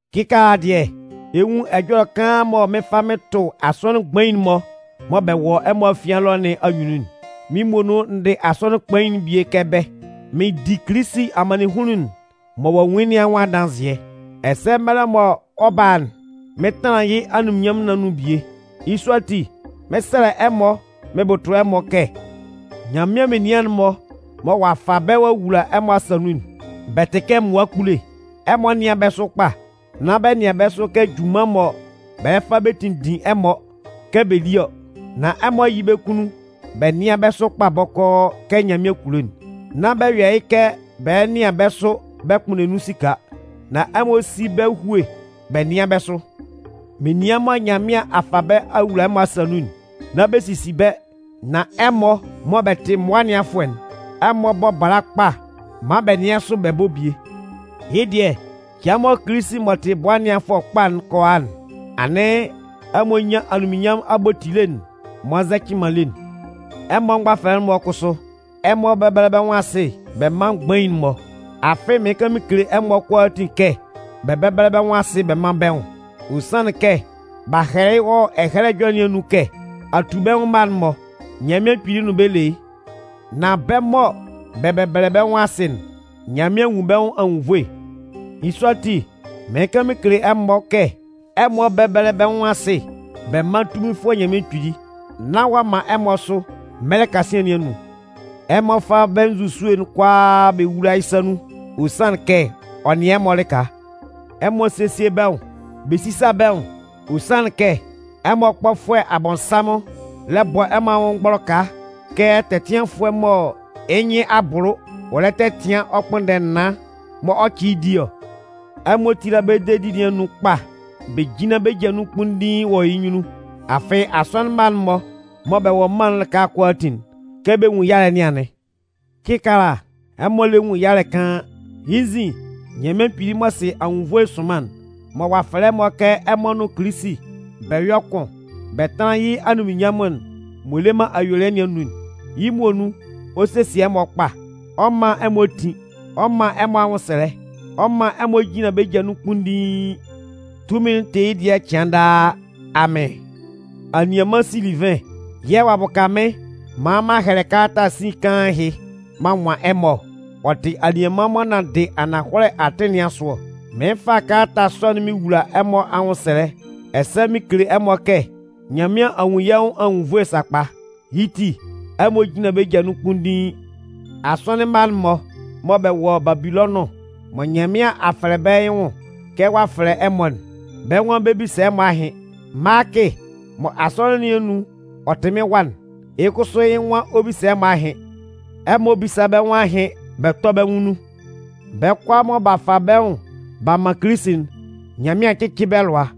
Kɩkaala dɩɛ, ɛ 'nwun ɛjɔlɛ kaan mɔ mɩɩn fa mɩn tʋ asɔnɩn mgbain'n-mɔ mɔ bɛ wɔ ɛmɔ afian ɛlɔ nɩn anyunnun'n. Mɩ́n muonun n dɩ asɔnɩn kpain'n bie kɛ bɛ́. Mɩn di Kilisi amannɩnhunnun'n mɔ ɔ'a nwun yɩ́ nɩn anwʋn adanzɩɛ, ɛsɛ mɛlɛ mɔ ɔ 'ba a'n, mɩn 'tanlan yɩ́ anunminnyanmʋn nɩn anun bie. Yɩ́ sɔ ati, mɩn 'sɛlɛ ɛmɔ mɩn bʋtʋ bɛ́ kɛ: Nyanmɩan menian'n-mɔ mɔ ɔ'a fa bɛ́ ɔ'a wula ɛmɔ asa nun'n, bɛ tɩ kɛ mmʋa kpule, ɛmɔ nɩ́an bɛ́ sʋ kpa. Nán bɛ nɩan bɛ́ sʋ kɛ junman mɔ bɛ lɛ fa bɛ tinndin ɛmɔ kɛ bɛ lí ɔ, nan ɛmɔ yɩ́ bɛ́ kunnun bɛ nɩ́an bɛ́ sʋ kpa bɔkɔɔ kɛ Nyanmɩan kulo'n. Nán bɛ yɔ yɩ́ kɛ bɛ lɛ nɩan bɛ́ sʋ bɛ kpʋnndɛ nun esika. Nan ɛmɔ sí bɛ́ hue bɛ nɩ́an bɛ́ sʋ. Menian mɔ Nyanmɩan a fa bɛ́ a wula ɛmɔ asa nun'n, nán bɛ sisi bɛ́, nan ɛmɔ mɔ bɛ tɩ mmʋa ɛnɩanfʋɛ'n, ɛmɔ bɔ́ bala kpa maan bɛ nɩ́an sʋ bɛ bɔ́ bie. Yɩ́ dɩɛ cɩan mɔ Kilisi m'ɔ tɩ Bʋa Ɛnɩanfʋɛ Kpain'n kɔ a'n, anɩn ɛmɔ nyan anunminnyanmʋn abotile'n m'ɔ nzɛcɩ man lé'n. Ɛmɔ mgbafɛlɛ'n-mɔ kʋsʋ, ɛmɔ bɛ́bɛlɛ bɛ́ nwʋn asɩ bɛ mán mgbain'n-mɔ. Afɩ mɩɩn kan mɩn kele ɛmɔ kʋalaa kɛ bɛ bɛ́bɛlɛ bɛ́ nwʋn asɩ bɛ mán bɛ́ nwʋn. Ɔ sanlɩn kɛ b'a hɛlɛ wɔ Ɛhɛlɛ Ɛjɔlɛ nɩn anun kɛ: Atubɛnwʋn mma'n-mɔ, Nyanmɩan Kpili nʋn bɛ́ le yɩ́. Nan bɛ́ mɔ bɛ bɛbɛlɛ bɛ́ nwʋn asɩ'n, Nyanmɩan nwun bɛ́ nwʋn anwunnvoe. Yɩ́ sɔ ati, mɩɩn kan mɩn kele ɛmɔ kɛ ɛmɔ bɛ́bɛlɛ bɛ́ nwʋn asɩ bɛ mán tunminfʋɛ Nyanmɩan Kpili, nán ɔ'a man ɛmɔ sʋ mɛlɛ kasian nɩn anun. Ɛmɔ fá bɛ́ nzusue'n kʋalaa bɛ wúla yɩ́ sa nun, ɔ sanlɩn kɛ ɔ nɩan ɛmɔ lɩka. Ɛmɔ sésie bɛ́ nwʋn, bɛ sísa bɛ́ nwʋn, ɔ sanlɩn kɛ ɛmɔ kpɔfʋɛ Abɔnsanmʋn lɛ bɔ ɛmɔ anwʋn mgbɔlɔka kɛ tɛtɩanfʋɛ mɔ yɩ́ nyɩn a bʋlʋ ɔ lɛ tɛtɩan ɔ kpʋnndɛ naan mɔ ɔ 'cɩ yɩ́ di ɔ. Ɛmɔ tíla bɛ́ dedi nɩn anun kpa bɛ jínlan bɛ́ ja nun kpunndiin wɔ yɩ́ nyunnun. Afɩ asɔnɩn mma'n-mɔ mɔ bɛ wɔ mân'n lɩka kʋalaatin'n, kɛ bɛ nwun yalɛ nɩn anɩn. Kɩkaala ɛmɔ lɛ nwun yalɛ kaan, yɩ́ nzin, Nyanmɩan Kpili m'ɔ sɩ anwunnvoe sʋnman'n, mɔ ɔ'a fɛlɛ ɛmɔ kɛ ɛmɔ nʋn Kilisi bɛ yɔ́ kʋn bɛ tánlan yɩ́ anunminnyanmʋn'n m'ɔ le man ayuelɩɛ nɩn anun'n, yɩ́ muonun, ɔ 'sesie ɛmɔ kpa. Ɔ 'man ɛmɔ tin. Ɔ 'man ɛmɔ anwʋnsɛlɛ. Ɔ 'man ɛmɔ jinlan bɛ́ ja nun kpunndiin. Tunmin'n tɩ yɩ́ dɩɛ cɩan daa! Amɩn. Anianman Silivɩn yɛ̂ ɔ'a bʋka mɩ́n maan m'an hɛlɛ kalata sin kaan ɛhɩ m'an nwan ɛmɔ ɔ. Ɔ tɩ anianman m'ɔ nanndɩ ananhɔlɛ atɩn nɩn asʋ ɔ. Mɩɩn fa kalata sɔ'n mɩn wowula ɛmɔ anwʋnsɛlɛ ɛsɛ mɩn kele ɛmɔ kɛ Nyanmɩan a nwun yɛ́ nwʋn anwunnvoe sakpa. Yɩ́ ti, ɛmɔ jínlan bɛ́ ja nun kpunndiin. Asɔnɩn mma'n-mɔ mɔ bɛ wɔ Babilɔnʋn mɔ Nyanmɩan a fɛlɛ bɛ́ yɩ́ nwʋn kɛ ɔ'a fɛlɛ ɛmɔ'n, bɛ́ nwan bɛ 'bisa ɛmɔ ahɩn. Maakɩ mɔ asɔnɩn nɩn anun ɔ tɩ mɩ́n wa'n, yɩ́ kʋsʋ yɩ́ nwan ɔ 'bisa ɛmɔ ahɩn. Ɛmɔ bísa bɛ́ nwʋn ahɩn bɛ tɔ́ bɛ́ nwʋn nun. Bɛ́ kʋalaa mɔ b'a fa bɛ́ nwʋn b'a man Kilisi'n, Nyanmɩan cɩ́cɩ bɛ́ lʋa.